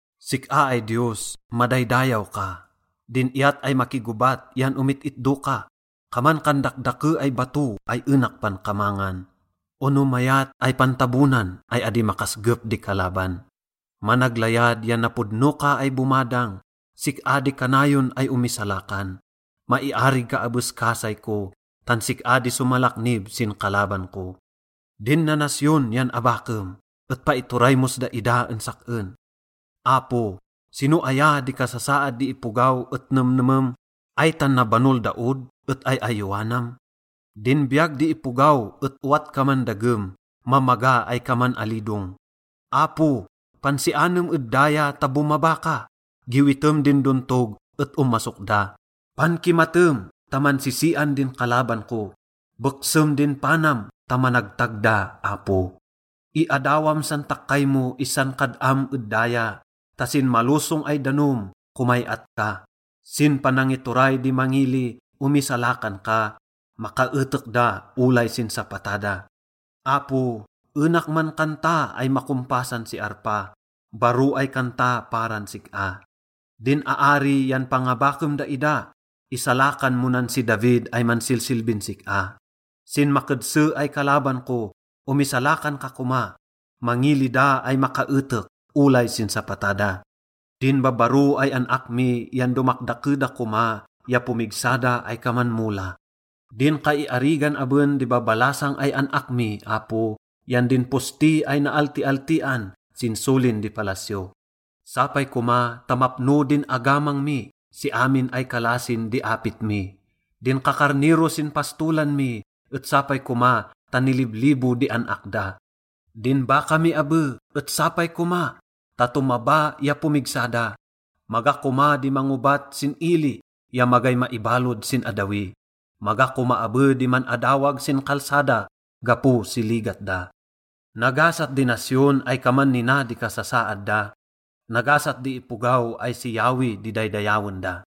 Sik-a ay Diyos, madaydayaw ka, din iyat ay makigobat yan omit-itdo ka. Kaman kan dakdake ay bato ay enak pankamangan ono mayat ay pantabonan ay adi makasgep di kalaban. Managlayad ya napodno ka ay bomadang, sik-a di kanayon ay omisalakan. Maiarig ka abes kasay ko tan sik-a di somalaknib sin kalaban ko. Din nanasyon yan abakem et paituray mos daida en sak-en. Apo, sino aya di kasasaad di ipogaw et nemnemem? Ay tan nabanol da od et ay-ayowanam? Din biyag di ipogaw et owat kaman dagem, mamaga ay kaman alidong. Apo, pansianem ed daya ta bomaba ka, giwitem din dontog et omasok da. Pankimatem ta mansisian din kalaban ko, beksem din panam ta managtag da, Apo. Iadawam san takkay mo issan kad-am ed daya, ta sin malosong ay danom, komay-at ka. Sin panangituray di mangili, omisalakan ka, makaetek da olay sin sapata da. Apo, enak mankanta ay makompasan si arpa, baro ay kanta paran sik-a. Din aari yan pangabakem daida, isalakan mo nan si David ay mansilsilbin sik-a. Sin makedse ay kalaban ko, omisalakan ka koma, mangili da ay makaetek olay sin sapata da. Din babbaro ay an-ak mi yan domakdake da koma ya pomigsa da ay kaman mola. Din kaiarigan aben din babalasang ay an-ak mi, Apo, yan din posti ay naaltialtian sin solin di palasyo. Sapay koma ta mapno din agamang mi si amin ay kalasin di apit mi. Din kakarnero sin pastolan mi et sapay koma ta niliblibo di an-ak da. Din baka mi abe et sapay koma ta tomaba ya pomigsa da. Maga koma di mangobat sin ili ya magay maibalod sin addawi. Maga koma abe di man-adawag sin kalsada gapo si ligat da. Nagasat di nasyon ay kaman nina di kasasaad da, nagasat di ipogaw ay si Yahweh di daydayawen da.